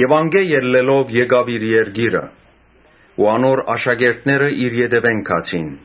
Անկէ ելլելով գնաց իր երկիրը։ Իր աշակերտները իր ետեւէն գացին։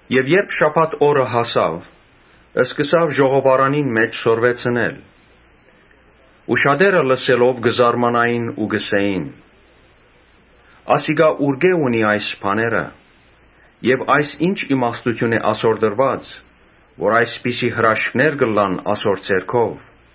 Երբ շաբաթ օրը հասաւ, սկսաւ ժողովարանին մէջ սորվեցնել։ Շատեր լսելով կը զարմանային ու կ’ըսէին. «Ասիկա ուրկէ՞ ունի այս բաները եւ այս ի՞նչ իմաստութիւն է ասոր տրուած, որ այսպիսի հրաշքներ կ’ըլլան ասոր ձեռքով։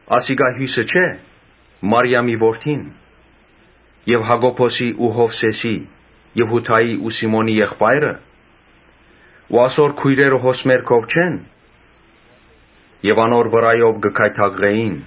Ասիկա հիւսնը չէ՞։ Մարիամին որդին եւ Յակոբոսին ու Յովսէսին եւ Յուդային ու Սիմոնին եղբայրը ու ասոր քոյրերը հոս մեր քով չե՞ն»։ Անոր վրայով կը գայթակղէին։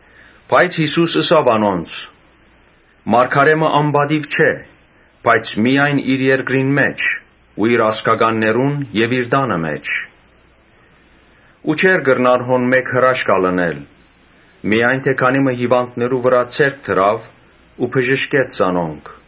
Բայց Յիսուս ըսաւ անոնց. «Մարգարէ մը ոեւէ տեղ անպատիւ չէ՝ բայց միայն իր երկրին, իր ազգականներուն եւ իր տանը մէջ»։ Ու չէր կրնար հոն հրաշք ընել, միայն քանի մը հիւանդներու վրայ ձեռք դրաւ ու բժշկեց զանոնք։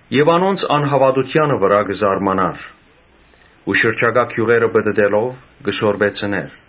Ինք անոնց անհաւատութեանը վրայ կը զարմանար ու շրջակայ գիւղերը պտըտելով՝ կը սորվեցնէր։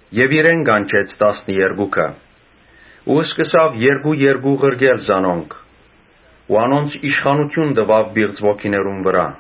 Իրեն կանչեց տասներկուքը ու երկու երկու ղրկեց զանոնք ու անոնց իշխանութիւն տուաւ պիղծ ոգիներուն վրայ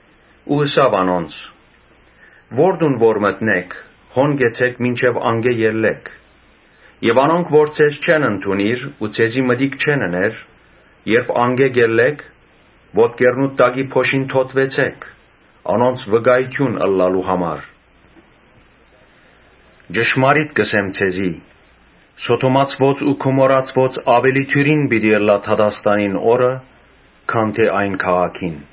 Ու աւելցուց. «Ո՛ր տուն որ մտնէք, հոն կեցէք մինչեւ անկէ ելլէք։ Անոնք որ ձեզ չեն ընդունիր ու ձեզի մտիկ չեն ըներ, երբ անկէ ելլէք, ոտքերնուդ տակի փոշին թօթուեցէք՝ անոնց վկայութիւն ըլլալու համար։ Ոմանք, չունինՃշմարիտ կ’ըսեմ ձեզի, Սոդոմացիներուն ու Գոմորացիներուն աւելի դիւրին պիտի ըլլայ դատաստանին օրը քան թէ այն քաղաքին՝ ՝»։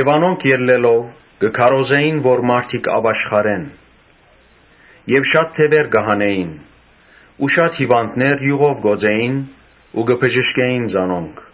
Անոնք ելլելով, կը քարոզէին որ մարդիկ ապաշխարեն։ Շատ դեւեր կը հանէին ու շատ հիւանդներ իւղով կ’օծէին ու կը բժշկէին զանոնք։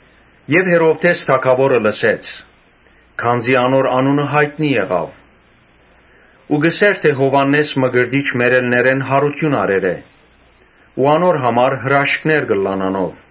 Երբ Հերովդէս թագաւորը լսեց, (քանզի անոր անունը յայտնի եղաւ,) ըսաւ. «Յովհաննէս Մկրտիչ մեռելներէն յարութիւն առեր է ու անոր համար հրաշքներ կ’ըլլան անով»։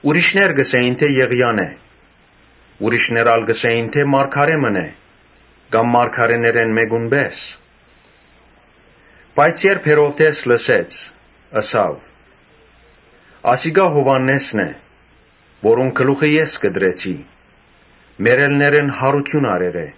Ուրիշներ կ’ըսէին. «Եղիան է». ուրիշներ ալ կ’ըսէին. «Մարգարէ մըն է, կամ մարգարէներէն մէկուն պէս»։ Բայց Հերովդէս կրկին ըսաւ. «Ասիկա Յովհաննէսն է, որուն գլուխը ես կտրեցի, մեռելներէն յարութիւն առեր է»։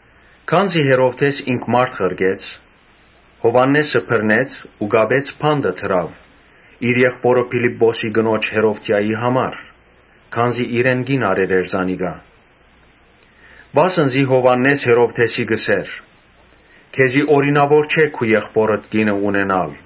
Քանզի Հերովդէս ինք մարդ ղրկեց Յովհաննէսը բռնեց ու կապելով բանտը դրաւ իր եղբօրը Փիլիպպոսի կնոջ՝ Հերովդիային՝ համար, քանզի իրեն կին առեր էր զանիկա։ Վասն զի Յովհաննէս Հերովդէսին կ’ըսէր. «Քեզի օրինաւոր չէ քու եղբօրդ կինը առնել»։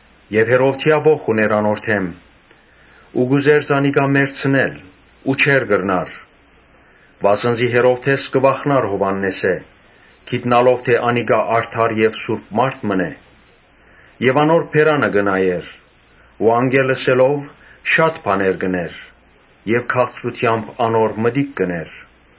Հերովդիա ոխ ունէր անոր դէմ ու կ’ուզէր զանիկա մեռցնել ու չէր կրնար. Վասն զի Հերովդէս կը վախնար Յովհաննէսէն, գիտնալով թէ անիկա արդար եւ սուրբ մարդ մըն է եւ անոր բերանը կը նայէր ու անկէ լսելով՝ շատ բաներ կ’ընէր եւ քաղցրութեամբ մտիկ կ’ընէր։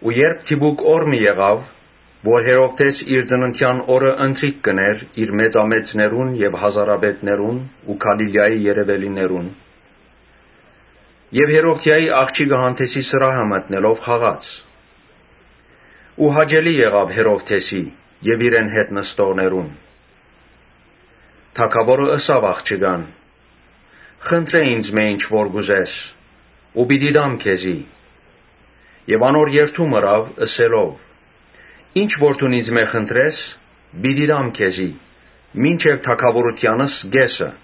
Յարմար օր մը եկաւ՝ երբ Հերովդէս իր ծննդեան օրը՝ ընթրիք կ’ընէր իր մեծամեծներուն եւ հազարապետներուն ու Գալիլիայի երեւելիներուն հետ։ Հերովդիայի աղջիկը հանդէսին սրահը մտնելով պարեց ու հաճելի եղաւ Հերովդէսին եւ իրեն հետ նստողներուն։ Թագաւորը ըսաւ աղջկան. «Խնդրէ ինծմէ ինչ որ կ’ուզես ու պիտի տամ քեզի»։ Եւ անոր երդում ըրաւ ըսելով. «Ինչ որ դուն ինծմէ խնդրես, պիտի տամ քեզի, մինչեւ թագաւորութեանս կէսը»։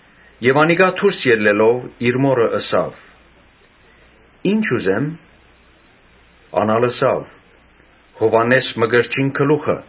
Աղջիկը դուրս ելլելով՝ իր մօրը հարցուց. «Ի՞նչ ուզեմ»։ Ան ալ ըսաւ. «Յովհաննէս Մկրտչին գլուխը»։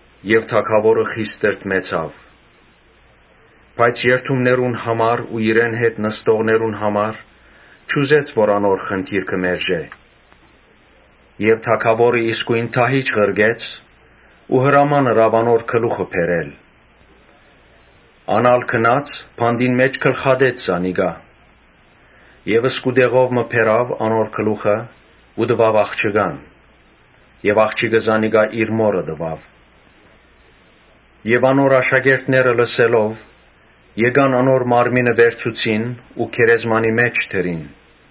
Թագաւորը խիստ տրտմեցաւ, բայց երդումներուն համար ու իրեն հետ նստողներուն համար չուզեց որ անոր խնդիրքը մերժէ։ Թագաւորը իսկոյն դահիճ մը ղրկեց ու հրաման ըրաւ Յովհաննէսին գլուխը բերել։ Ան ալ գնաց, բանտին մէջ գլխատեց զանիկա Եւ սկուտեղով մը բերաւ անոր գլուխը ու տուաւ աղջկան։ Աղջիկը զանիկա իր մօրը տուաւ։ Յովհաննէսին աշակերտները լսելով՝ եկան անոր մարմինը վերցուցին ու գերեզմանի մէջ դրին։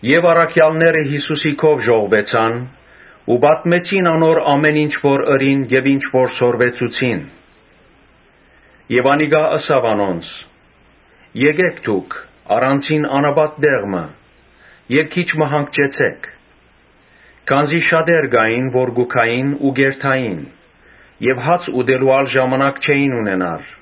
Առաքեալները Յիսուսին քով ժողվուեցան ու պատմեցին անոր ամէն ինչ որ ըրին եւ ինչ որ սորվեցուցին։ Անիկա ալ ըսաւ անոնց. «Եկէք դուք առանձին անապատ մը եւ քիչ մը հանգչեցէք», քանզի շատեր կու գային ու կ’երթային եւ հաց ուտելու ալ ժամանակ չէին ձգեր։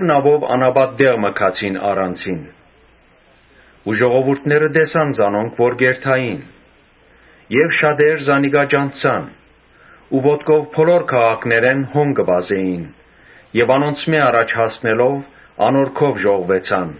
Նաւով անապատ մը գացին՝ առանձինն։ Ու ժողովուրդը տեսաւ զանոնք, որ կ’երթային։ Շատեր զանիկա ճանչցան ու ոտքով բոլոր քաղաքներէն հոն կը վազէին։ Անոնցմէ առաջ հասնելով անոր քով ժողվուեցան։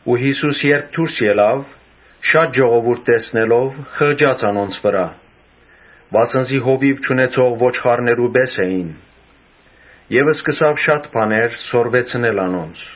Յիսուս, երբ դուրս ելաւ, շատ ժողովուրդ տեսնելով խղճաց անոնց վրայ, վասն զի հովիւ չունեցող ոչխարներու պէս էին եւ շատ բաներ սորվեցուց անոնց։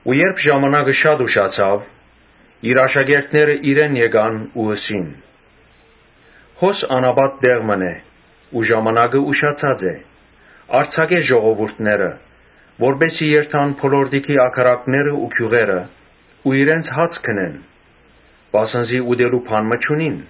Երբ ժամանակը շատ անցաւ, իր աշակերտները իրեն եկան ու ըսին. «Հոս անապատ տեղ մըն է, ժամանակը անցած է։ Արձակէ ժողովուրդը որպէս զի երթան բոլորտիքի ագարակները ու գիւղերը ու իրենց հաց գնեն, վասն զի ուտելու բան մը չունին»։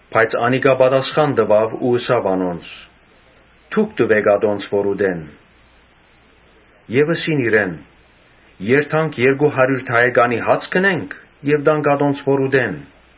Բայց անիկա պատասխան տուաւ ու ըսաւ անոնց. «Դուք տուէք ատոնց որ ուտեն»։ Ըսին իրեն. «Երթանք երկու հարիւր դահեկանի հաց գնենք եւ տա՞նք ատոնց որ ուտեն»։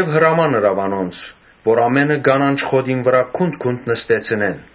Հրաման ըրաւ անոնց՝ որ ամէնքը կանանչ խոտին վրայ գունդ գունդ նստեցնեն։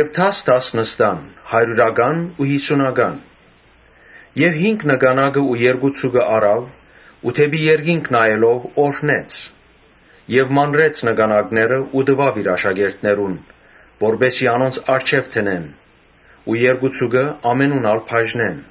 Դաս դաս նստան, հարիւրական, յիսունական։ Հինգ նկանակը ու երկու ձուկը առաւ ու դէպի երկինք նայելով՝ օրհնեց եւ մանրեց նկանակները ու տուաւ իր աշակերտներուն, որպէս զի անոնց առջեւ դնեն ու երկու ձուկը ամենուն ալ բաժնեն։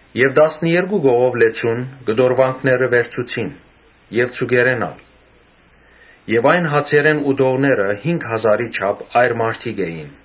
Եւ տասներկու կողով լեցուն՝ կտորուանք վերցուցին եւ ձուկերէն ալ։ Այն հացերէն ուտողները հինգ հազարի չափ այր մարդիկ էին։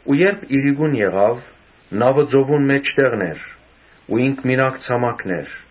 Երբ իրիկուն եղաւ, նաւը ծովուն մէջտեղն էր, բայց ինք մինակ ցամաքն էր։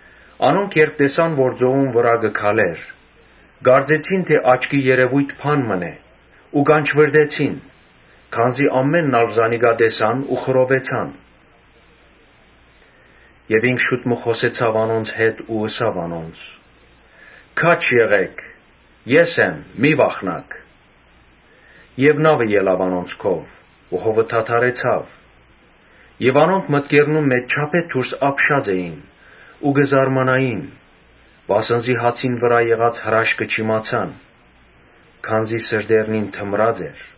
Անոնք, երբ տեսան, որ ծովուն վրայէն կը քալէր, կարծեցին թէ աչքի երեւոյթ մըն է, ուստի կանչուըռտեցին. Քանզի ամէնքն ալ զանիկա տեսան ու խռովեցան։ Ինք շուտ մը խօսեցաւ անոնց հետ ու ըսաւ. «Քա՛ջ եղէք, ե՛ս եմ, մի՛ վախնաք»։ Եւ նաւը ելաւ անոնց քով ու հովը դադարեցաւ։ Անոնք մտքերնուն մէջ չափէ դուրս ապշած էին ու կը զարմանային, Վասն զի հացին վրայ եղած հրաշքը չիմացան, քանզի սրտերնին թմրած էր։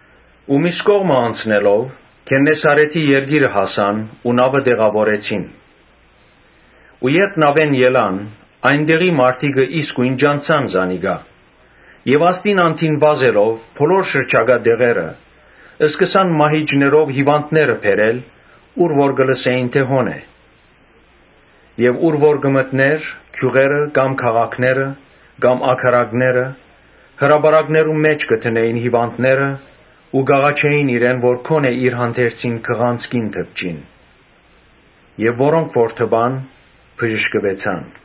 Միւս կողմը անցնելով՝ Գեննեսարէթի երկիրը հասան ու նաւը տեղաւորեցին։ Երբ նաւէն ելան, այն տեղի մարդիկը իսկոյն ճանչցան զանիկա Եւ ասդին անդին վազեցին բոլոր շրջակայքը։ Սկսան մահիճներով հիւանդներ բերել՝ ուր որ կը լսէին թէ հոն է։ Եւ ուր որ կը մտնէր, գիւղերը կամ քաղաքները կամ ագարակները, հրապարակներուն մէջ կը դնէին հիւանդները ու կ’աղաչէին իրեն որ գոնէ իր հանդերձին քղանցքին դպչին։ Անոնք որ դպան՝ բժշկուեցան։